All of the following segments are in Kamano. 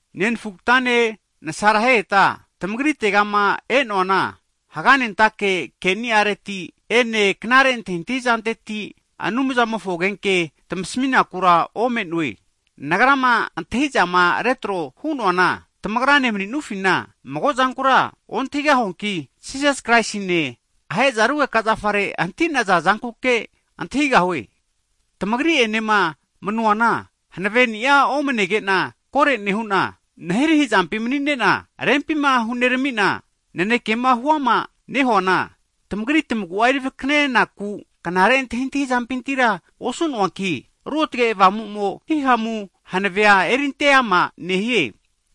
Nenfugtane nasareheta, tamagrite'ma e'noana, haganentake ke'ni'areti ene knare antahintahi zanteti Anumzamofo agenke tmasminakura ome'noe. Nagra'ma antahi'zama retro hu'noana, tamagrane mani'nufina mago'zankura ontahigahuanki, Jisas Kraisima ahe'za rugeka zafare hanti'naza zankuke antahigahue. Tmagri'enema manuana hanave'nia omnege'na, kore nehu'na, nahirahi zampi mani'ne'na, rempima hunerami'na, nanekema huama nehuana, tamagri tmagu'a eri vakanenaku knare antahintahi zampintira osu'noanki, Ruotge Avamumo hihamu hanave'a erinte ama nehie.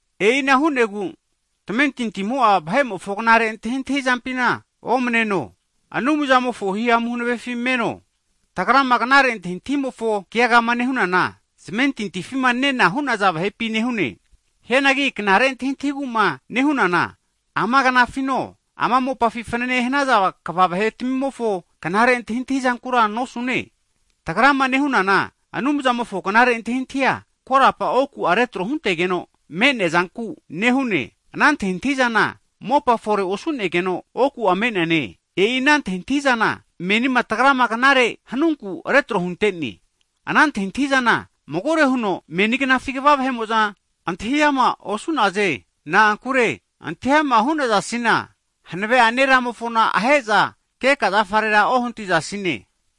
E'ina hu'negu tamentintimo'a vahe'mofo knare antahintahi zampina omneno, Anumzamofo himamu hanavefi meno. Tagrama knare antahintahizamofo keagama nehunana, zmentintifima nena hu'naza vahepi nehune. Hianagi ama knare antahintahigu'ma nehunana, ama knafino, ama mopafi fanane hanaza kva vahetmimofo knare antahintahi zankura nosune. Tagrama nehunana Anumzamofo knare antahintahia, korapa oku'a retro huntegeno me'neazanku nehune. Ana antahintahizana mopa fore osu'negeno oku me'neana, e'i ana antahintahizana, menima tagrama knare hanunku retro hunte'ne. Ana antahintahizana magore huno meni gnafi kva vahe'mo'za antahi ama osu'naze. Na'ankure antahi ama hu'nazasina, hanave'ane Ramofona ahe'za keka zafarera ohantizasine.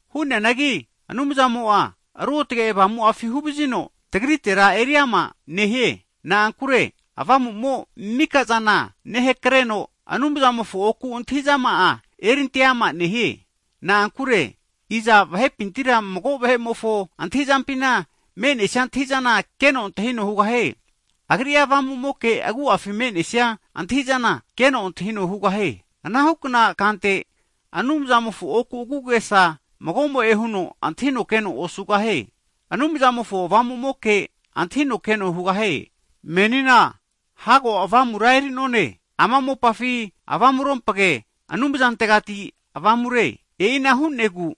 Hu'neanagi Anumzamo'a, Ruotge Avamu'afi huvazino, tagritera eriama nehie. Na'ankure Avamu'mo mika zana hakareno, Anumzamofo oku'a antahi'zama'a erinte ama nehie. Na'ankure, iza vahepintira mago vahe'mofo antahi'zampima me'nesia antahi'zana keno antahino hugahie? Agri'a avamu'moke agu'afi me'nesia antahi'zana keno antahino hugahie. Anahukna kante Anumzamofo oku'a agu'agesa mago'mo'e huno antahino keno osugahie. Anumzamofo Avamu'moke antahino keno hugahie. Menina hago Avamura eri'none, ama mopafi avamurompage Anumzamofontegati Avamure, e'ina hu'negu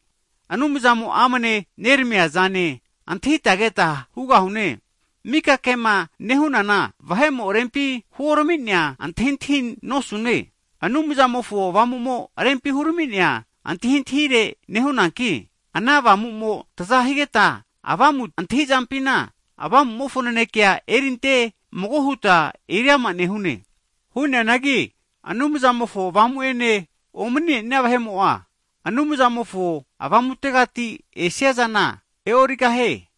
Anumzamo amne neramiazane antahita keta hugahune. Mika kema nehunana, vahe'mo rempi huorami'nea antahintahi nosune. Anumzamofo Avamu'mo rempi hurami'nea antahintahire nehunankino, ana Avamu'mo taza higeta, avamu antahizampi Avamu'mofo nanekea eri ante mago huta eriama nehune. Hu'neanagi Anumzamofo Avamu ene omani'nea vahe'mo'a, Anumzamofo Avamutegati esiazana e'origahie.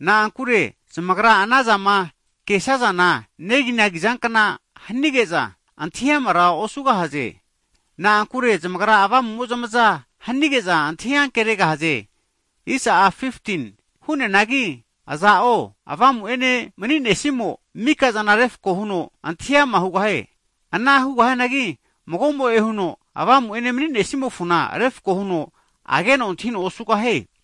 Na'ankure zmagra anazama kesazana neginagi zankna hanige'za, antahi'amara osugahaze. Na'ankure zamagra Avamu'mo zmaza hanige'za antahi ankeregahaze. Hu'neanagi aza'o Avamu'ene mani'nesimo'a, mika'zana refko huno antahi ama hugahie. Ana hugahianagi mago'mo'e huno Avamu'ene mani'nesimofona refko huno ageno antahino osugahie.